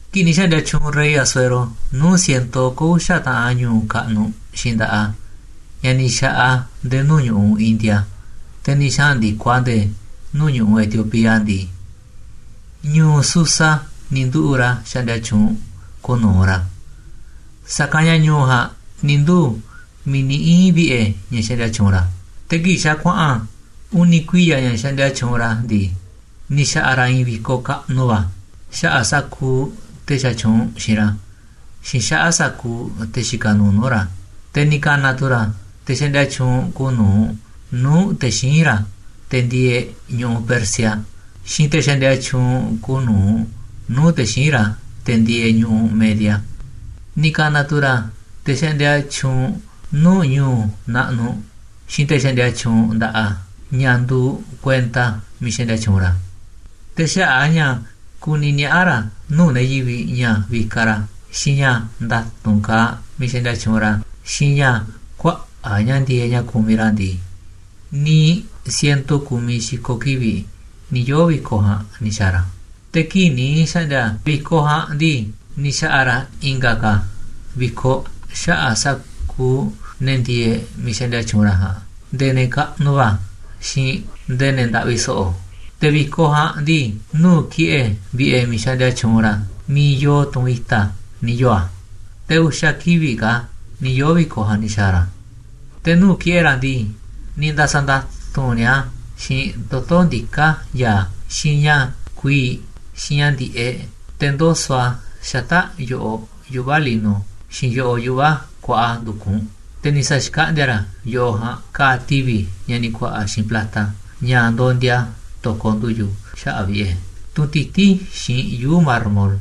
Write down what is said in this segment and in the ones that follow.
Kii̱ꞌ ni̱ xa̱ꞌndi̱a̱ tyuunꞌ rey Asuero nuu̱ꞌ ciento oko̱ uxa̱ taꞌan ñu̱u̱ kaꞌnuꞌ xiinꞌ nda̱ꞌaꞌ a̱, ña̱ ni̱ xa̱ꞌaꞌ a̱ nde̱e̱ nuu̱ꞌ ñu̱ꞌuꞌ India, te̱ ni̱ xaꞌa̱n ndi̱koꞌ a̱ nde̱e̱ nuu̱ꞌ ñu̱ꞌuꞌ Etiopía ndii, ñu̱u̱ Susa ni̱ nduꞌu̱ꞌ ra̱ xaꞌndia tyuunꞌ kuuꞌ nu̱uꞌ ra̱, sa̱kanꞌ ña̱ ñu̱u̱ ja̱a̱nꞌ ni̱ nduu̱ miiꞌ ni̱ ii̱n vi̱ꞌe̱ ña̱ xaꞌndia tyuunꞌ ra̱. Te̱ kii̱ꞌ xa̱ kuaꞌa̱n uni̱ kuiya̱ ña̱ xaꞌndia tyuunꞌ ra̱ ndii, ni̱ xa̱ꞌa̱ ra̱ i̱i̱n vi̱koꞌ kaꞌnuꞌ va̱ xaꞌa̱ꞌ sa̱kuuꞌ te̱ xaꞌndia tyuunꞌ xiinꞌ ra̱, xiinꞌ xaꞌa̱ꞌ sa̱kuuꞌ te̱ xikaꞌ nuuꞌ nuu̱ꞌ ra̱. Te̱ ni̱ ka̱na̱ tu̱ ra̱ te̱ xaꞌndia tyuunꞌ kuuꞌ nu̱uꞌ nuu̱ꞌ te̱ xíinꞌ ra̱, te̱ ndieeꞌ ñu̱ꞌuꞌ Persia, xiinꞌ te̱ xaꞌndia tyuunꞌ kuuꞌ nu̱uꞌ nuu̱ꞌ te̱ xíinꞌ ra̱, te̱ ndieeꞌ ñu̱ꞌuꞌ Media. Ni̱ ka̱na̱ tu̱ ra̱ te̱ xaꞌndia tyuunꞌ nuu̱ꞌ ñu̱u̱ naꞌnuꞌ, xiinꞌ te̱ xaꞌndia tyuunꞌ nda̱ꞌaꞌ a̱, ña̱ nduuꞌ kuenta miiꞌ xaꞌndia tyuunꞌ ra̱. Te̱ xaꞌa̱ꞌ a̱ ña̱ kuni niaꞌa̱ ra̱ nuu̱ꞌ ne̱ yivi̱ꞌ ña̱ vikaꞌ ra̱ xiinꞌ ña̱ nda̱tu̱nꞌ kaaꞌ miiꞌ xaꞌndia tyuunꞌ ra̱ xiinꞌ ña̱ kuaꞌa̱ꞌ ña̱ ndi̱e̱eꞌ ña̱ kumiꞌ ra̱ ndii, niiꞌ ciento ku̱miꞌ xi̱ko̱ kivi̱ꞌ ni̱ yoo̱ vi̱koꞌ ja̱a̱nꞌ ni̱ xa̱a̱ ra̱. Te̱ kii̱ꞌ ni̱ xkaꞌndi̱a̱ vi̱koꞌ ja̱a̱nꞌ ndii, ni̱ xa̱ꞌa̱ ra̱ i̱nga̱ ka̱ vi̱koꞌ xaꞌa̱ꞌ sa̱kuuꞌ ne̱ ndieeꞌ miiꞌ xaꞌndia tyuunꞌ ra̱ ja̱a̱nꞌ, nde̱e̱ ne̱ kaꞌnuꞌ va̱ xiinꞌ nde̱e̱ ne̱ ndaꞌvi so̱ꞌo̱. Te̱ vi̱koꞌ ja̱a̱nꞌ ndii, nuu̱ꞌ ki̱ꞌe̱ vi̱ꞌe̱ miiꞌ xaꞌndia tyuunꞌ ra̱, miiꞌ yoo tunꞌ i̱ta̱, ni̱ yoo̱ a̱. Te̱ uxa̱ kivi̱ꞌ ka̱ ni̱ yoo̱ vi̱koꞌ ja̱a̱nꞌ ni̱ xa̱a̱ ra̱. Te̱ nuu̱ꞌ ki̱ꞌe̱ ra̱ ndii, ni̱ nda̱sa̱nda̱tu̱nꞌ ni̱a̱ a̱ xiinꞌ toto̱ ndiká ya̱a̱, xiinꞌ ña̱ kuii̱ꞌ, xiinꞌ ña̱ ndi̱ꞌeꞌ, te̱ ndoso̱ꞌ a̱ xata̱ꞌ yo̱ꞌoꞌ yuꞌva̱ lino, xiinꞌ yo̱ꞌoꞌ yuꞌva̱ kuaꞌa ndu̱kunꞌ. Te̱ ni̱ sa̱xkaꞌndi̱a̱ ra̱ yo̱ꞌoꞌ ja̱a̱nꞌ ka̱a̱ tivi̱ ña̱ ni̱ ku̱a̱ꞌa̱ xiinꞌ plata, ña̱ ndondia to̱koꞌ ndu̱yu̱ xaꞌa̱ꞌ vi̱ꞌe̱, tunꞌ tití xiinꞌ yuu̱ꞌ mármol.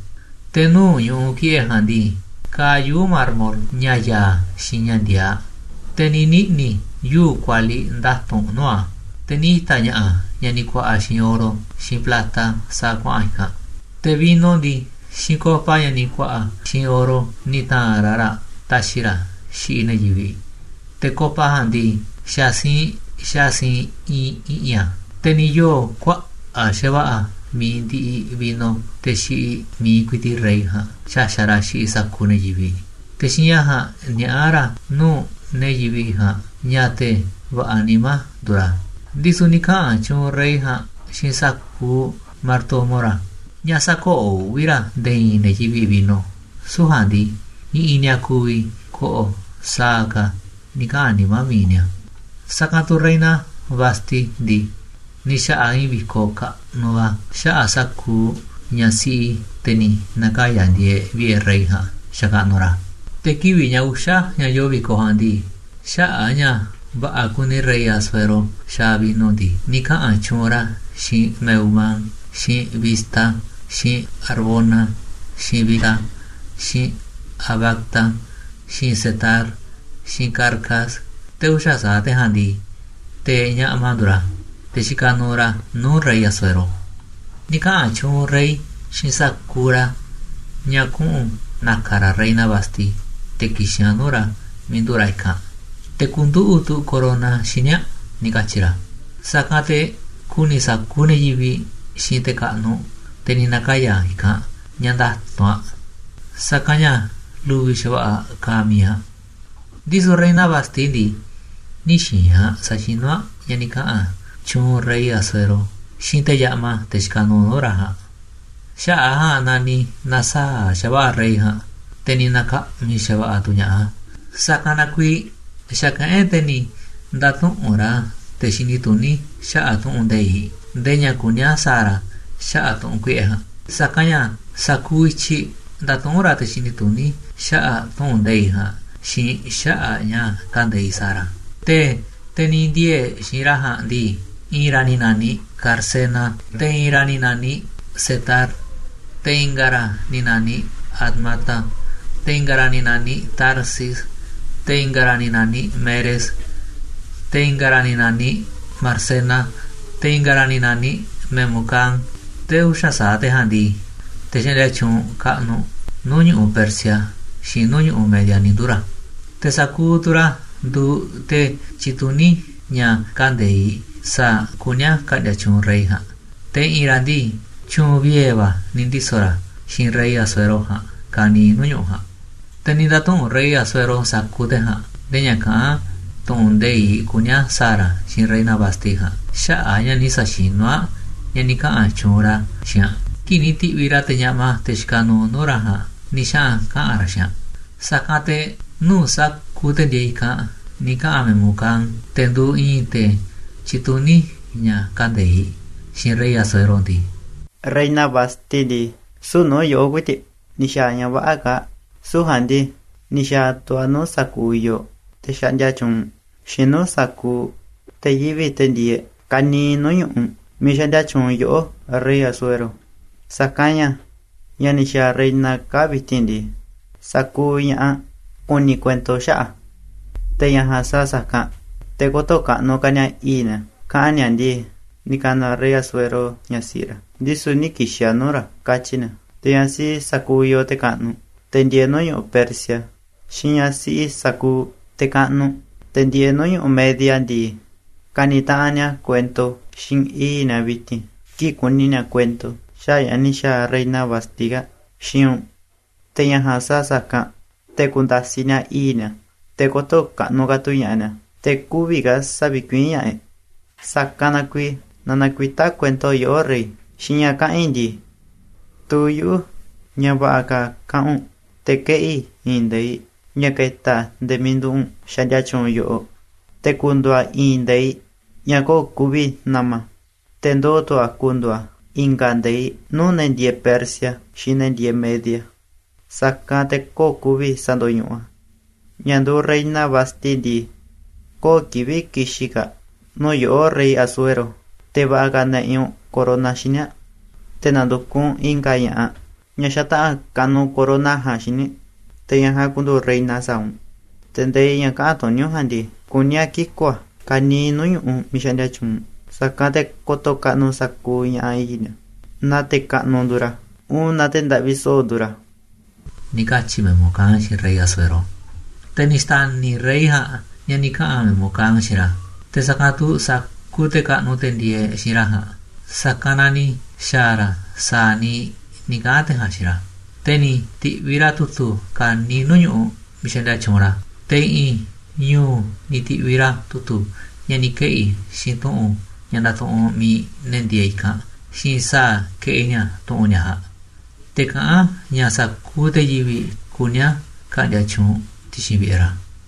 Te̱ nuu̱ꞌ ñu̱ꞌuꞌ ki̱ꞌe̱ ja̱a̱nꞌ ndii, kaaꞌ yuu̱ꞌ mármol, ña̱ ya̱a̱ xiinꞌ ña̱ ndiaaꞌ. Te̱ ni̱ niꞌni̱ yuu̱ꞌ kualiꞌ nda̱tu̱nꞌ nuu̱ꞌ a̱. Te̱ ni̱ ita̱ ña̱ꞌa̱ ña̱ ni̱ ku̱a̱ꞌa̱ xiinꞌ oro xiinꞌ plata sa̱a̱ kuaꞌa̱n i̱kanꞌ. Te̱ vino ndii, xiinꞌ copa, ña̱ ni̱ ku̱a̱ꞌa̱ xiinꞌ oro, ni̱ ta̱a̱nꞌ ra̱ raꞌ taxiꞌ ra̱ xiꞌiꞌ ne̱ yivi̱ꞌ. Te̱ copa ja̱a̱nꞌ ndii, xa̱ siinꞌ xa̱ siinꞌ iinꞌ i̱ꞌi̱n a̱. Te̱ ni̱ yoo̱ kuaꞌa̱ꞌ xa̱va̱ꞌa̱ mi̱iꞌ ndiꞌiꞌ vino te̱ xiꞌiꞌ mi̱iꞌ ku̱i̱ti̱ꞌ rey ja̱a̱nꞌ xaxa̱ꞌ ra̱ xiꞌiꞌ sa̱kuuꞌ ne̱ yivi̱ꞌ, te̱ xiinꞌ ña̱ ja̱a̱nꞌ niaꞌá ra̱ nuu̱ꞌ ne̱ yivi̱ꞌ ja̱a̱nꞌ ña̱ te̱ va̱ꞌa̱ nimá nduuꞌ ra̱. Ndisu̱ ni̱ kaꞌa̱n tyuunꞌ rey ja̱a̱nꞌ xiinꞌ sa̱kuuꞌ martomo ra̱ ña̱ sä̱koꞌoꞌ uꞌvi̱ ra̱ nde̱e̱ i̱i̱n ne̱ yivi̱ꞌ vino, süu̱ꞌ ja̱a̱nꞌ ndii, i̱ꞌi̱n ni̱a̱ ku̱vi̱ ko̱ꞌo̱ sa̱a̱ ka̱ ni̱ kaꞌa̱n nimá mi̱iꞌ ni̱a̱. Sa̱kanꞌ tu̱ reina Vasti ndii, ni̱ xa̱ꞌa̱ aꞌ i̱i̱n vi̱koꞌ kaꞌnuꞌ va̱ xaꞌa̱ꞌ sa̱kuuꞌ ñaꞌ siꞌi te̱ ni̱ na̱kaya̱ ndieeꞌ vi̱ꞌe̱ rey ja̱a̱nꞌ xakaꞌnuꞌ ra̱. Te̱ kivi̱ꞌ ña̱ uxa̱ ña̱ yoo vi̱koꞌ ja̱a̱nꞌ ndii, xaꞌa̱ꞌ a̱ ña̱ va̱ꞌa̱ kuni rey Asuero xaaꞌ vino ndii, ni̱ kaꞌa̱n tyuunꞌ ra̱ xiinꞌ Mehumán, xiinꞌ Bizta, xiinꞌ Harbona, xiinꞌ Bigta, xiinꞌ Abagta, xiinꞌ Zetar, xiinꞌ Carcas. Te̱ uxa̱ sa̱aꞌ te̱ ja̱a̱nꞌ ndii, te̱ ñaꞌma nduuꞌ ra̱, te̱ xikaꞌ nuuꞌ ra̱ nuu̱ꞌ rey Asuero. Ni̱ kaꞌa̱n tyuunꞌ rey xiinꞌ sa̱kuuꞌ ra̱ ña̱ kuꞌu̱n na̱ka̱ ra̱ reina Vasti te̱ ki̱xi̱n aꞌ nuu̱ꞌ ra̱ miiꞌ nduꞌu̱ꞌ ra̱ i̱kanꞌ, te̱ ku̱nduꞌu̱ꞌ tu̱ corona xíniꞌ aꞌ, ni̱ katyi̱ ra̱, sa̱kanꞌ te̱ ku̱ni̱ sa̱kuuꞌ ne̱ yivi̱ꞌ xiinꞌ te̱ kaꞌnuꞌ, te̱ ni̱ na̱kaya̱ i̱kanꞌ, ña̱ nda̱tu̱nꞌ aꞌ, sa̱kanꞌ ña̱ lu̱vi̱ xa̱va̱ꞌa̱ kaaꞌ mi̱iꞌ aꞌ. Ndisu̱ reina Vasti ndii, nï̱ xi̱i̱n aꞌ sa̱xinú aꞌ ña̱ ni̱ kaꞌa̱n tyuunꞌ rey Asuero xiinꞌ te̱ ñaꞌma, te̱ xikaꞌ nuuꞌ nuu̱ꞌ ra̱ ja̱a̱nꞌ. Xaꞌa̱ꞌ a̱ ja̱a̱nꞌ na ni̱ na̱saa̱ꞌ xa̱va̱ꞌa̱ rey ja̱a̱nꞌ, te̱ ni̱ na̱ka̱ꞌmi̱ xa̱va̱ꞌa̱ tu̱ ña̱ꞌaꞌ a̱. Sa̱kanꞌ na kuiiꞌ xa̱kaꞌán e̱ꞌ, te̱ ni̱ nda̱tuꞌu̱nꞌ ra̱ te̱ xini tuní xaꞌa̱ꞌ tu̱ꞌu̱n nde̱iꞌ, ndee ña̱ kuní a̱ sa̱a̱ ra̱ xaꞌa̱ꞌ tu̱ꞌu̱n kuiꞌe̱ ja̱a̱nꞌ, sa̱kanꞌ ña̱ sa̱kuuꞌ i̱tyiꞌ ndatuꞌúnꞌ ra̱ te̱ xini tuní xaꞌa̱ꞌ tu̱ꞌu̱n nde̱iꞌ ja̱a̱nꞌ xiinꞌ xaꞌa̱ꞌ ña̱ kande̱iꞌ sa̱a̱ ra̱. Te̱ te̱ ni̱ ndiee̱ xi̱i̱nꞌ ra̱ ja̱a̱nꞌ ndii, i̱i̱n ra̱ ni̱ na̱niꞌ Carsena, te̱ i̱i̱n ra̱ ni̱ na̱niꞌ Setar, te̱ i̱nga̱ ra̱ ni̱ na̱niꞌ Admata, te̱ i̱nga̱ ra̱ ni̱ na̱niꞌ Tarsis, te̱ i̱nga̱ ra̱ naniꞌ Meres, te̱ i̱nga̱ ra̱ ni̱ na̱niꞌ Marsena, te̱ i̱nga̱ ra̱ ni̱ na̱niꞌ Memucán. Te̱ uxa̱ sa̱aꞌ te̱ ja̱a̱nꞌ ndii, te̱ xaꞌndia tyuunꞌ kaꞌnuꞌ nuu̱ꞌ ñu̱ꞌuꞌ Persia xiinꞌ nuu̱ꞌ ñu̱ꞌuꞌ Media ni̱ nduu̱ ra̱. Te̱ sa̱kuuꞌ tu̱ ra̱ nduuꞌ te̱ tyituní ña̱ kande̱iꞌ sa̱a̱ kuní a̱ ka̱ꞌndi̱a̱ tyuunꞌ rey ja̱a̱nꞌ. Te̱ i̱ꞌi̱n ra̱ ndii, tyu̱u̱n vie̱ va̱ ni̱ ndiso̱ ra̱ xiinꞌ rey Asuero ja̱a̱nꞌ ka̱niiꞌ nuu̱ꞌ ñu̱ꞌuꞌ ja̱a̱nꞌ. Te̱ ni̱ nda̱tuꞌu̱nꞌ rey Asuero sa̱kuuꞌ te̱ ja̱a̱nꞌ ndee ña̱ kaꞌán tu̱ꞌu̱n nde̱iꞌ kuní a̱ sa̱a̱ ra̱ xiinꞌ reina Vasti ja̱a̱nꞌ xaꞌa̱ꞌ a̱ ña̱ nï̱ sa̱xinu̱ aꞌ ña̱ ni̱ kaꞌa̱n tyuunꞌ ra̱ xiinꞌ aꞌ kii̱ꞌ ni̱ ti̱ꞌviꞌ ra̱ te̱ ñaꞌma, te̱ xikaꞌ nuuꞌ nuu̱ꞌ ra̱ ja̱a̱nꞌ, ni̱ xaꞌa̱n kaꞌa̱n ra̱ xiinꞌ aꞌ. Sa̱kanꞌ te̱ nuu̱ꞌ sa̱kuuꞌ te̱ ndieeꞌ i̱kanꞌ ni̱ kaꞌa̱n Memucán, te̱ nduuꞌ i̱i̱n te̱ tyituní ña̱ kande̱iꞌ, xiinꞌ rey Asuero ndii: ―Reina Vasti ndii, süu̱ꞌ nuu̱ꞌ yoꞌó ku̱i̱ti̱ꞌ ni̱ xa̱a̱ aꞌ ña̱ vä̱ꞌa̱ kaa̱ꞌ, süu̱ꞌ ja̱a̱nꞌ ndii, ni̱ xa̱a̱ tu̱ aꞌ nuu̱ꞌ sa̱kuuꞌ yooꞌ, te̱ xaꞌndia tyuunꞌ, xiinꞌ nuu̱ꞌ sa̱kuuꞌ te̱ yivi̱ꞌ, te̱ ndieeꞌ ka̱niiꞌ nuu̱ꞌ ñu̱ꞌuꞌ miiꞌ xaꞌndia tyuunꞌ yoꞌó, rey Asuero. Sa̱kanꞌ ña̱ ña̱ ni̱ xa̱a̱ reina kaa̱ꞌ vi̱ti̱n ndii, sa̱kuuꞌ ña̱ꞌaꞌ ku̱ni̱ kuento xaꞌa̱ꞌ a̱, te̱ ña̱ ja̱a̱nꞌ sa̱a̱ sa̱kanꞌ, te̱ kö̱to̱ kaꞌnuꞌ ka̱ ni̱a̱ i̱i̱ꞌ ni̱a̱, kaꞌa̱n ni̱a̱ ndii: “Ni̱ ka̱na̱ rey Asuero ñaꞌ siꞌi ra̱, ndisu̱ nï̱ ki̱xi̱n aꞌ nuu̱ꞌ ra̱,” katyi̱ ni̱a̱. Te̱ ñaꞌ siꞌi sa̱kuuꞌ yooꞌ, te̱ kaꞌnuꞌ, te̱ ndieeꞌ nuu̱ꞌ ñu̱ꞌuꞌ Persia, xiinꞌ ñaꞌ siꞌi sa̱kuuꞌ te̱ kaꞌnuꞌ, te̱ ndieeꞌ nuu̱ꞌ ñu̱ꞌuꞌ Media ndii, ka̱ni̱ taꞌanꞌ ni̱a̱ kuento xiinꞌ i̱i̱ꞌ ni̱a̱ vi̱ti̱n kii̱ꞌ ku̱ni̱ ni̱a̱ kuento xaꞌa̱ꞌ ña̱ ni̱ xa̱a̱ reina Vasti kaa̱ꞌ xiinꞌ u̱nꞌ. Te̱ ña̱ ja̱a̱nꞌ sa̱a̱ sa̱kanꞌ, te̱ ku̱nda̱siꞌ ni̱a̱ i̱i̱ꞌ ni̱a̱, te̱ kö̱to̱ kaꞌnuꞌ ka̱ tu̱ ña̱ꞌaꞌ ni̱a̱, te̱ kü̱vi̱ ka̱ sa̱vi̱kuiín ña̱ꞌaꞌ e̱ꞌ. Sa̱kanꞌ na kuiiꞌ, naaꞌ nakuitá kuento yoꞌó, rey, xiinꞌ ña̱ kaꞌa̱n i̱ ndii. Tuu yuꞌu̱ ña̱ va̱ꞌa̱ ka̱ kaꞌa̱n u̱nꞌ, te̱ keꞌi̱ i̱i̱n nde̱iꞌ ña̱ ke̱ta̱ nde̱e̱ miiꞌ nduꞌu̱ꞌ u̱nꞌ xaꞌndia tyuunꞌ yoꞌoꞌ, te̱ ku̱ndu̱u̱ a̱ i̱i̱n nde̱iꞌ ña̱ köo̱ꞌ ku̱vi̱ na̱ma̱, te̱ ndoo̱ tu̱ a̱ ku̱ndu̱u̱ a̱ i̱nga̱ nde̱iꞌ nuu̱ꞌ ne̱ ndieeꞌ Persia xiinꞌ ne̱ ndieeꞌ Media, sa̱kanꞌ te̱ köo̱ꞌ ku̱vi̱ sa̱ndo̱ñuꞌuꞌ. Ñaꞌ nduuꞌ reina Vasti ndii, köo̱ꞌ kivi̱ꞌ ki̱xi̱n ka̱ aꞌ nuu̱ꞌ yoꞌó, rey Asuero, te̱ va̱ꞌa̱ ka̱ na̱ꞌi̱ u̱nꞌ corona xíniꞌ aꞌ, te̱ na̱ndu̱kuꞌ u̱nꞌ i̱nga̱ ña̱ꞌaꞌ, ñaꞌ xataꞌa̱n ka̱nuꞌ corona ja̱a̱nꞌ xíniꞌ, te̱ ñaꞌ ja̱a̱nꞌ ku̱ndu̱u̱ reina sa̱a̱ u̱nꞌ. Te̱ nde̱iꞌ ña̱ kaꞌa̱n tuní u̱nꞌ ja̱a̱nꞌ ndii, kuní a̱ kiku̱ a̱ ka̱niiꞌ nuu̱ꞌ ñu̱ꞌuꞌ miiꞌ xaꞌndia tyuunꞌ u̱nꞌ, sa̱kanꞌ te̱ ko̱to̱ kaꞌnuꞌ sa̱kuuꞌ ña̱ꞌaꞌ i̱i̱ꞌ ni̱a̱, naaꞌ te̱ kaꞌnuꞌ nduuꞌ ra̱ uun naaꞌ te̱ ndaꞌvi so̱ꞌo̱ nduuꞌ ra̱ ―ni̱ katyi̱ Memucán xiinꞌ rey Asuero. Te̱ ni̱ xta̱ni̱ rey ja̱a̱nꞌ ña̱ ni̱ kaꞌa̱n Memucán xiinꞌ ra̱, te̱ sa̱kanꞌ tu̱ sa̱kuuꞌ te̱ kaꞌnuꞌ, te̱ ndieeꞌ xiinꞌ ra̱ ja̱a̱nꞌ, sa̱kanꞌ na ni̱ xa̱a̱ ra̱ sa̱a̱ niiꞌ ni̱ kaꞌa̱n te̱ ja̱a̱nꞌ xiinꞌ ra̱. Te̱ ni̱ ti̱ꞌviꞌ ra̱ tu̱tu̱ ka̱niiꞌ nuu̱ꞌ ñu̱ꞌuꞌ miiꞌ xaꞌndia tyuunꞌ ra̱, te̱ i̱ꞌi̱n ñu̱u̱ ni̱ ti̱ꞌviꞌ ra̱ tu̱tu̱ ña̱ ni̱ keꞌi̱ xiinꞌ tu̱ꞌu̱n ña̱ ndatuꞌunꞌ mi̱iꞌ ne̱ ndieeꞌ i̱kanꞌ, xiinꞌ sa̱a̱ keꞌi ni̱a̱ tu̱ꞌu̱n ni̱a̱ ja̱a̱nꞌ. Te̱ kaꞌán a̱ ña̱ sa̱kuuꞌ te̱ yivi̱ꞌ kuní a̱ ka̱ꞌndi̱a̱ tyuunꞌ ti̱xi̱n vi̱ꞌe̱ ra̱.